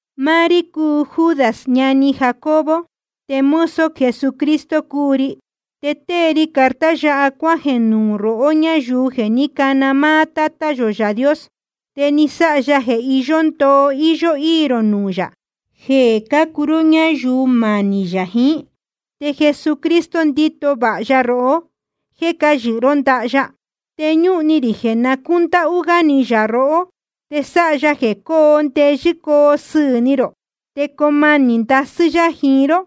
Máá rí cúu Judas ñani Jacobo, te mozo Jesucristo cúu ri. Te tée ri carta yáha cuájeē nuū rohó ñáyuu jeē ní cana máá Tátá yō Yaā Dios, te ni sáha ya jeē iyó ndoo íyó íī rō nuū yā jeē cácuu ró ñáyuu manī yā jíín. Te Jesucristo ndíto vāha ya rohó jéē cáyɨhɨ ró ndaha ya. Te ñúhun ni rī jeē na cúndáhú gá ni yā rohó, te sáha ya jeē coo ndeyɨ́ coo sɨɨ̄ ni rō, te coo manī ndasɨ́ yá jiín ró,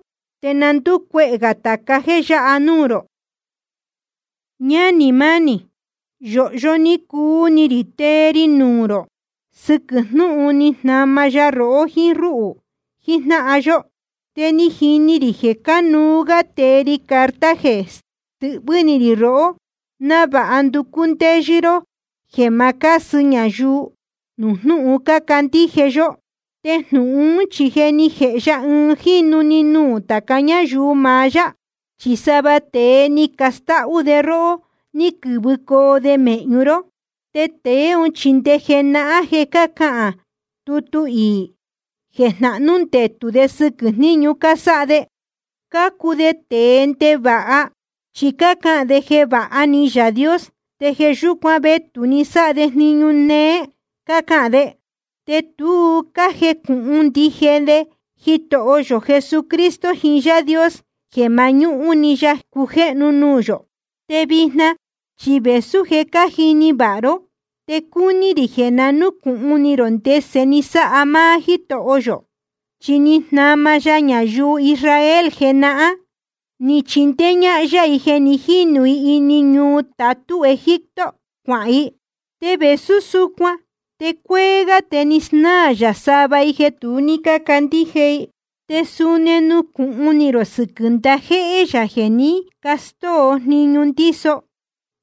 te na ndúcuehē gā tāca jéē yáha núū rō. Ñánī mánī, yōhyo ní cuu ni rī tee ri nuū rō sɨquɨ̄ jnúhun ni jnama ya rohó jíín rúhū jijnáhan yó. Te ni jini rī jeē cánuú gá tee ri carta jeē stɨhvɨ́ ni rī rohó návāha nducú ndéyɨ́ ró jeē ma cásɨ ñayuu nuū jnúhun cácandíje yó. Te jnūhun ún chi je ni jēhe ya ɨɨn jínu‑ni nuū tāca ñáyuu maá yá. Chi sava tēe ni castáhú de róhó ní quɨ̄vɨcoo de mēhñu ró. Te tēe ún chi nde jenahán je cáhán tutu iī jeē jnahnú ndetū de sɨquɨ̄ jníñu cásáha de. Cácuu de tēe ndevāha, chi cácahān de jeē vāha ni Yaā Dios, te jeē yúcuan vetū‑ni sáha de jniñu néé, cácahān de. Te tu cájejnúhún ndije de Jitoho yō Jesucristo jiín Yaā Dios, jeē mañúhún‑ni ya cujéhnu nuū yō. Te vijna chi vēsú je cájini vāha ró, te cúní rī jeē na núcūhun ni rō ndese ni sáha máá Jítoho yō. Chi ni jnama ya ñayuu Israel jenahán, ni chindéé ñájnáhan ya i jeē ní jinu i ini ñuu tatú Egipto cuahān i. Te vēsú súcuan te cuéé gá te ni snáā yā sava i jeē tu ní cácandíje i. Te suni nucūhun ni rō sɨquɨ̄ ndajéhé yā jeē ní castóo jniñu ndíso,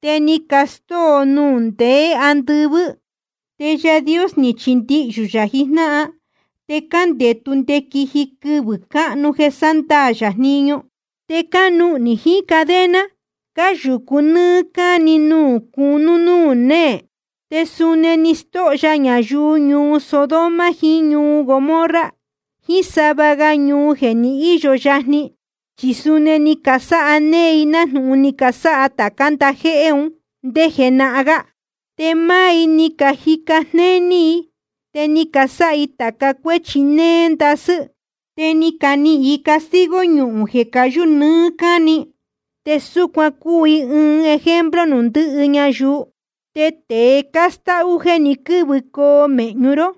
te ni castóo nuū ní ndeē andɨvɨ́. Te Yaā Dios ni chindihyū yā jijnáhan, te cándetu nde quiji quɨvɨ̄ cáhnu jeē sándaā yā jniñu. Te cánuhnī jiín cadena, cáyūcu nɨ́ɨ́ cáni nuū cunú núū néē. Te suni ni stóho ya ñayuu ñuu Sodoma jiín ñuu Gomorra jiín sava ga ñuu jeē ní īyo yajni, chi suni ni casáha néé i nájnūhun ni casáha tācá ndajéhé un ndé jenahán gá. Te máá i ni cajica jnéní i te ni casáha i tāca cuéchi néé ndasɨ́. Te ni canihīn i castigo ñuhūn jeē cayú nɨɨ́ cáni, te súcuan cúu i ɨɨn ejemplo nuū ndɨhɨ ñayuu. Te tēe cástáhú jeē ní quɨ̄vɨcoo mēhñu ró,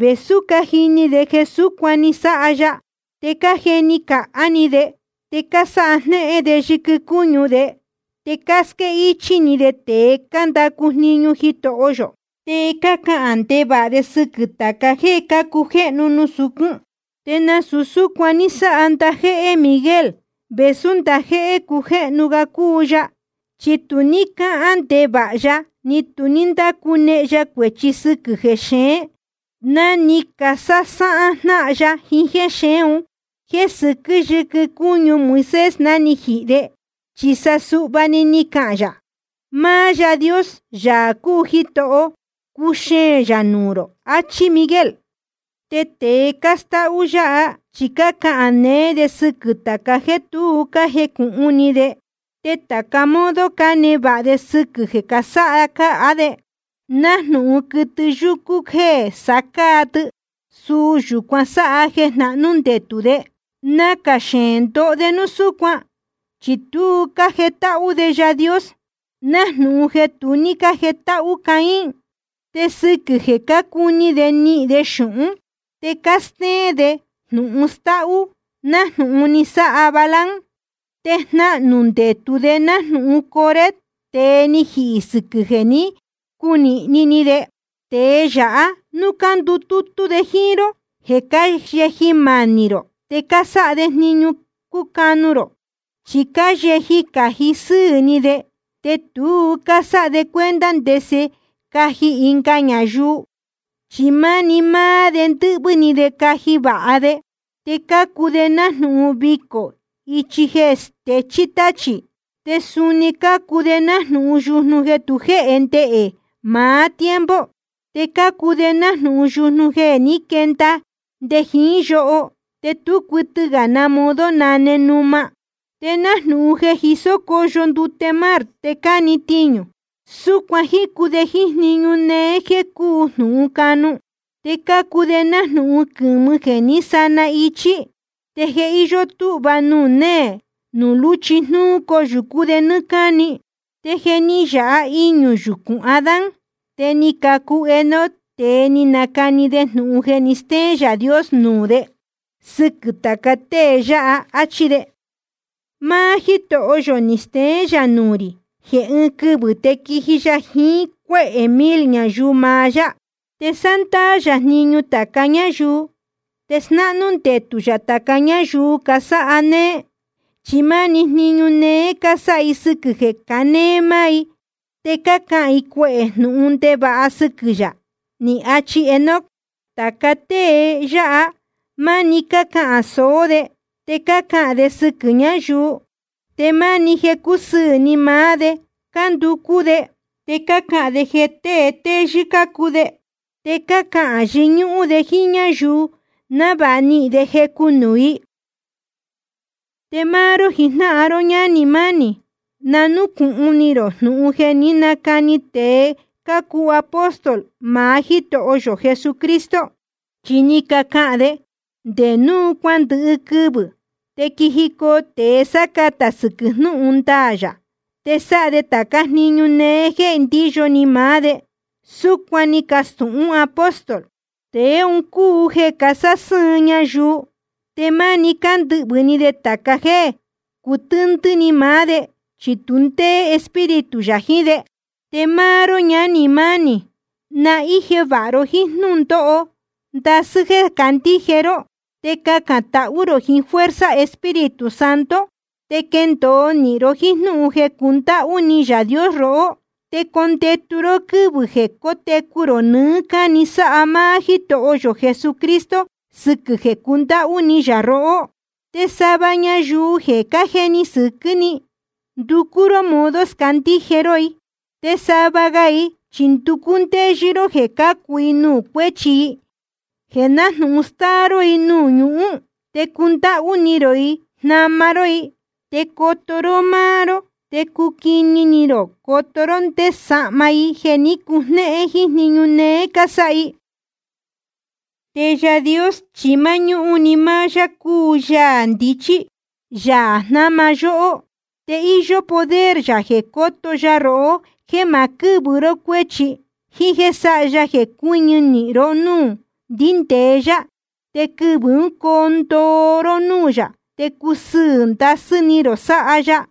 vēsú cájini de jeē súcuan ni sáha ya, te cájeni cāhá ni de, te cásáha jnéhén de yɨquɨ cúñu de, te cásquéhichī ni de tēe cándacu jniñu Jitoho yō, te cácahān ndevāha de sɨquɨ̄ tāca jéē cácujéhnu nuū sucún. Te nasūu súcuan ní sáha ndajéhé Miguel, vēsú ndajéhé cujéhnu ga cúu ya. Chi tu ní cáhán ndevāha ya ni tu ní ndácunehen ya cuēchi sɨquɨ̄ jexeén ná ni casásáhán jnáhan ya jiín jéxeén un jeē sɨquɨ́ yɨquɨ cúñu Moisés ná ni jihī de. Chi suhva‑ni ni cahān yā: Máá Yaā Dios, Yaā cúu Jitoho, cuxeēn yā nuū rō, ni achi Miguel. Te tēe cástáhú yáha chi cácahān neé de sɨquɨ̄ tāca jéē tu cájecūhun ni de. Te tāca modo cánevāha de sɨquɨ̄ jeē sá cáa de, nájnūhun quɨtɨ yúcú jéē sá cáa tɨ, suu yūcuan sáha jeē jnahnú ndetū de. Nacā xeēn ndoho de núu súcuan, chi tu cájetáhú de Yaā Dios, nájnūhun jeē tu ní jétáhú Caín. Te sɨquɨ̄ jeē cácuni de nihīn de xūhún te cástéén de jnūhun stáhú, nájnūhun ni sáha Balaam. Te jnahnū ndetū de nájnūhun Coré, tēe ni jihī sɨquɨ̄ jeē ní cunīhni ni de. Tēe yáha núu cándutútú de jíín ró jeē cáyeji manī rō, te cásáha de jniñu cúcanu rō. Chi cáyeji cájihi sɨɨ̄ ni de, te tu cásáha de cuenta ndese caji ɨnga ñayuu, chi máni máá de ndɨ́hvɨ́ ni de caji vāha de. Te cácuu de nájnūhun vicō íchi jéē stechí táchī. Te suni cácuu de nájnūhun yujnu jeē tu jéhe ndehē maá tiempo. Te cácuu de nájnūhun yujnu jeē ní quenda nde jiín yoho, te tú cuɨtɨ gā na modo nane numa. Te nájnūhun jeē jisó cóyo ndute mar te cáne tiñū, súcuan jícu de jíín jniñu néé jéē cúu jnūhun canu. Te cácuu de nájnūhun quɨ̄mɨ jeē ní sana ichi. Te je íyó túhva nuū néē nuū lúchi jnúú coyūcú de nɨ́ɨ́ cáni. Te jeē ní yāha iñū yucūn Adán, te ni cacu Enoc, te ni nacani de jnūhun jeē ni stéén Yaā Dios nuū de sɨquɨ̄ tāca tée yáha, áchí de: Máá Jítoho yō ni steén yā nuū rī jeē ɨɨn quɨvɨ̄ te quiji ya jiín cuéhē mil ñayuu maá yá. Te sándaā yā jniñu tāca ñáyuu, te snáhnú ndetū yā tāca ñáyuu casáha néé. Chi máni jniñu néé cásáha i sɨquɨ̄ jeē canéé máá i, te cácahān i cuehē jnūhun ndevāha sɨquɨ̄ yā. Ni achi Enoc. Tāca tée yáha máni cácahān sōó de, te cácahān de sɨquɨ̄ ñayuu. Te máni jeē cúsɨɨ̄ ni maá de cánducú de. Te cácahān de jeē tée téyɨ́ cácuu de, te cácahān yɨñúhún de jíín ñáyuu návāha nihīn de jecu nuū i. Te máá ró jijnáhan ró ñánī mánī, na núcūhun ni rō jnūhun jeē jé ni canacani tēe cácuu apóstol maá Jítoho yō Jesucristo. Chi ni cacahān de: Nde nuū cuándɨhɨ quɨvɨ̄ te quijicoo tēe sácatā sɨquɨ̄ jnúhun ndaā yā, te sáha de tācá jniñu néé jéē ndíyo ni maá de. Súcuan ni cacastūhún apóstol. Tēe un cúu jeē casásɨ́ɨn ñayuu. Te máni cándɨhvɨ̄ ni de tāca jéē cutɨ́ndɨ́ ni maá de, chi tu ndéé Espíritu yā jiín de. Te máá ró ñánī mánī, na íje vāha ni rō jiín jnúhun ndoo ndasɨ́ jéē cácandíje ró. Te cacān tahú rō jiín fuerza Espíritu Santo. Te quendōo nīhin ró jíín jnúhun jeē cundáhú ni Yaā Dios rohó. Te condetu ró quɨ́vɨ̄ jeē cótecu rō nɨɨ́ cáni sáha máá Jítoho yō Jesucristo sɨquɨ̄ jeē cundáhú ni yā rohó. Te sava ñayuu jeē cájeni sɨquɨ́ ni, nducú ró modo scandíje ró i. Te sava ga i chi nducú ndéyɨ́ ró jeē cácu i nuū cuéchi i, jeē nájnūhun stáa ró i nuū ñuhún. Te cundáhú ni rō i jnama ró i, te coto ró máá ró, te cuquini ni rō coto ró nde sahma i jeē ní cujnéhén jíín jniñu néé cásáha i. Te Yaā Dios chi máñúhún‑ni máá yá cúu Yaā ndichí, Yaā jnáma yóhó. Te íyó poder yā jeē coto ya rohó jéē ma quɨ́vɨ ró cuéchi, jíín jéē sáha ya jeē cuɨ́ñɨ ró núū ndíndēe yá, te quɨvɨ̄ ún coo ndoo ró núū yā, te cusɨɨ̄ ndasɨ́ ni rō sáha ya.